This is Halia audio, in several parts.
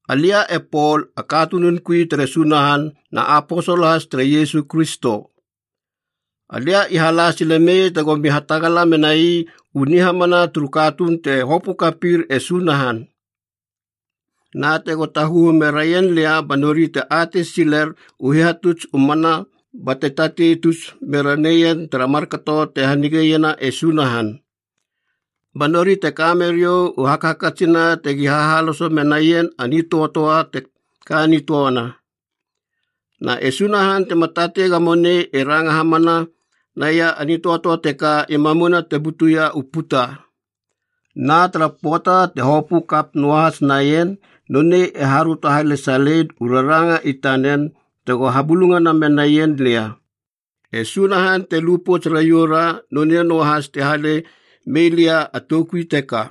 Alia e Pol, a katunun kuia tere Sunahan na aposol has tere Iesu Kristo. Alia i hala silemei tegomi hatagala menai u nihamana turu katuun te hopö kapir e Sunahan. Na tego taguhu meraien lia ba nori te atei siler u hihatuts u mana, bate tatei tus mera neien tara markato te hanigeiena e Sunahan. Ba nori te kameriou u hakhakatsina tegi hahaloso menaien a nitöatöa te ka nitöana. Na e Sunahan, tema tatei gamo nei e ranga hamana naia a nitöatöa teka i mamuna te butuia u puta. Na tara pöata te hopö kap noahas naien, nonei e haröto halesalein u raranga i tanen tego habulungana menaien lia. E Sunahan te lu pouts raioura, nonei noahas te hale meilia a toukui teka.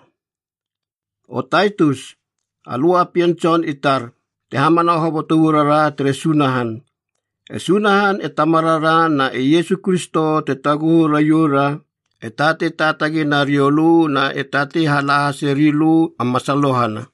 O Taitus, alö a pien tson i tar, te hamana hoboto uarara tere Sunahan. E Sunahan e Tamarara na e Iesu Kristo te taguhu raioura e tatei taatagi nariou lö na e tatei hala hase rilö a masalohana.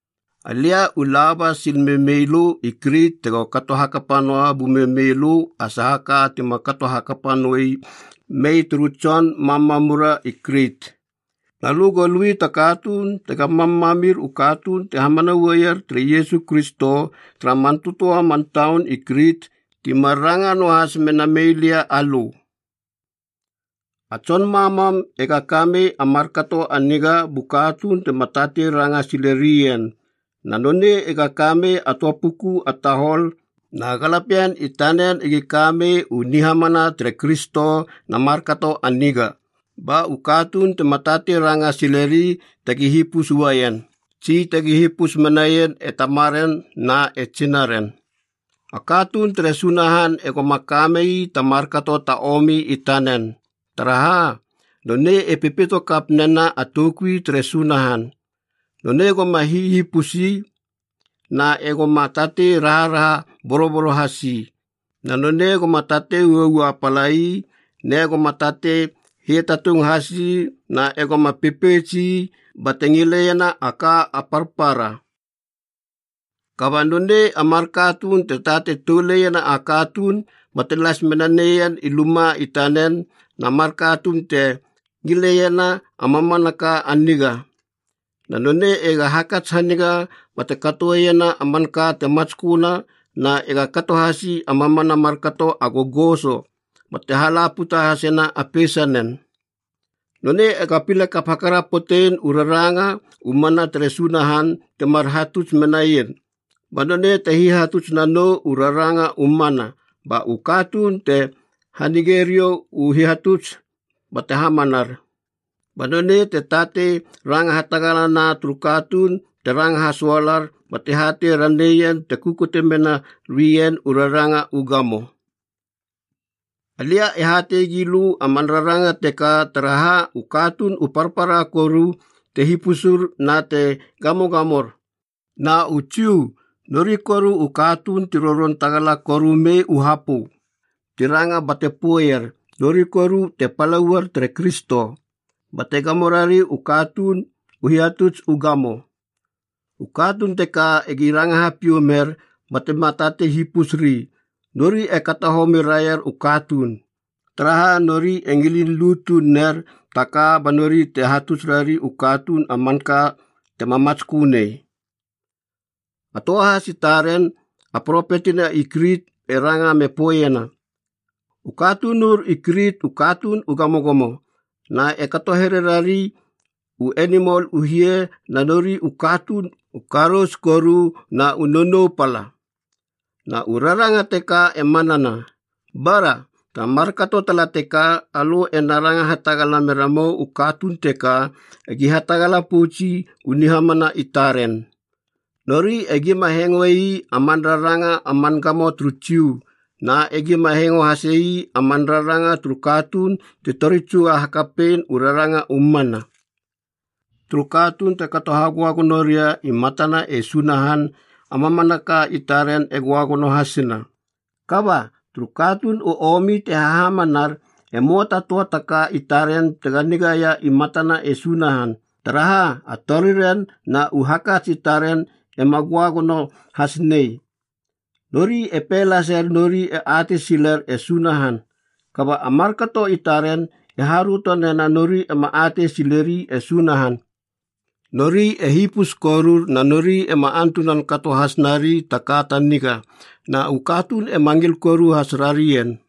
Alia u laba sil memeilö i Krit tego kato hakapa noa bumemeilö a saha ka tima kato hakapa noe mei turu tson mamamura i Krit. Na lö go lui ta katuun tega mammamir u katuun te hamana uaier tere Iesu Kristo, tara man tötöa man taun i Krit ti mar ranga noahas mena meilia alö. A tson mammam ega kamei a markato a niga bu katuun tema tatei ranga sile rien, na nonei ega kamei a töa puku a tahol na galapien i tanen egi kamei u nihamana tere Kristo na markato a niga, ba u katuun tema tatei ranga sileri tegi hipus uaien, tsi tegi hipus menaien e tamaren na e tsinaren. A katuun tere Sunahan e goma kamei ta markato ta omi i tanen, taraha, nonei e pepeito kap nena a toukui tere Sunahan. Nonei goma hihipus ii na e goma tatei raharaha boroboro has ii. Na nonei goma tatei uaua pala iib ne goma tatei hiatatung has ii na egoma pepeits ii bate ngileiena a ka a parpara. Kaba nonei a mar katuun te tatei toulena a katuun bate las mena neien i luma i tanen, na mar katuun te ngileiena a mamanaka a niga. Na nonei ega hakats haniga bate katoeiena a manka te matsköna, na ega kato hasi a mamana markato a gogoso bate hala puta hasena a peisanen. Nonei ega pile kap hakarapotein u raranga u mana tere Sunahan timar hatuts menaien, ba nonei te hihatuts nanou u raranga u mana, ba u katuun te hanigeriou u hihatuts bate hamanar. Ba nonei te tatei ranga hatagalana turu katuun te ranga hasoalar bate hatei raneien te kukute mena rien u raranga u gamo. Alia e hatei gilö a man raranga teka, taraha, u katuun u parpara koru te hipusur na te gamogamor. Na u Jiu, nori koru u katuun ti roron tagala korumei u hapö, ti ranga bate poeier nori koru te pala uaier tere Kristo, bate gamo rari u katuun u hihatuts u gamo. U katuun teka egi ranga hapiou mer batema tatei hipusri, nori e kato homi raier u katuun. Taraha nori e ngilin lu tuun ner taka ba nori te hatuts rari u katuun a manka tema matskö nei. A töa has i taren, a propetina i Krit, e ranga me poeiena, “U katunur i Krit u katuun u gamogamo na e kato here rari u enimol u hie, na nori u katuun u karous koru na u nonou pala.” Na u raranga teka e manana. Bara, tara markato tala teka alö ena ranga hatagala meramou u katuun teka egi hatagala poutsi u nihamana i taren. Nori egima hengoei a man raranga a man gamo turu Jiu, na egima hengo hase ii a man raranga turu katuun ti tori tsuga hakapein u raranga u mana. Turu katuun te kato hagöagono ria i matana e Sunahan, a mamanaka i taren e göagono hasina. Kaba, turu katuun u omi te hahamanar, e möa ta töa ta ka i taren tega nigaia i matana e Sunahan, taraha, a toriren na u hakats i taren ema göagono has nei. Nori e pei laser nori e atei siler e Sunahan, kaba a markato i taren te haröto nena nori ema atei sileri e Sunahan. Nori e hipus korur, na nori ema antunan kato has nari ta ka ta niga. Na u katuun ema ngil koru has rarien.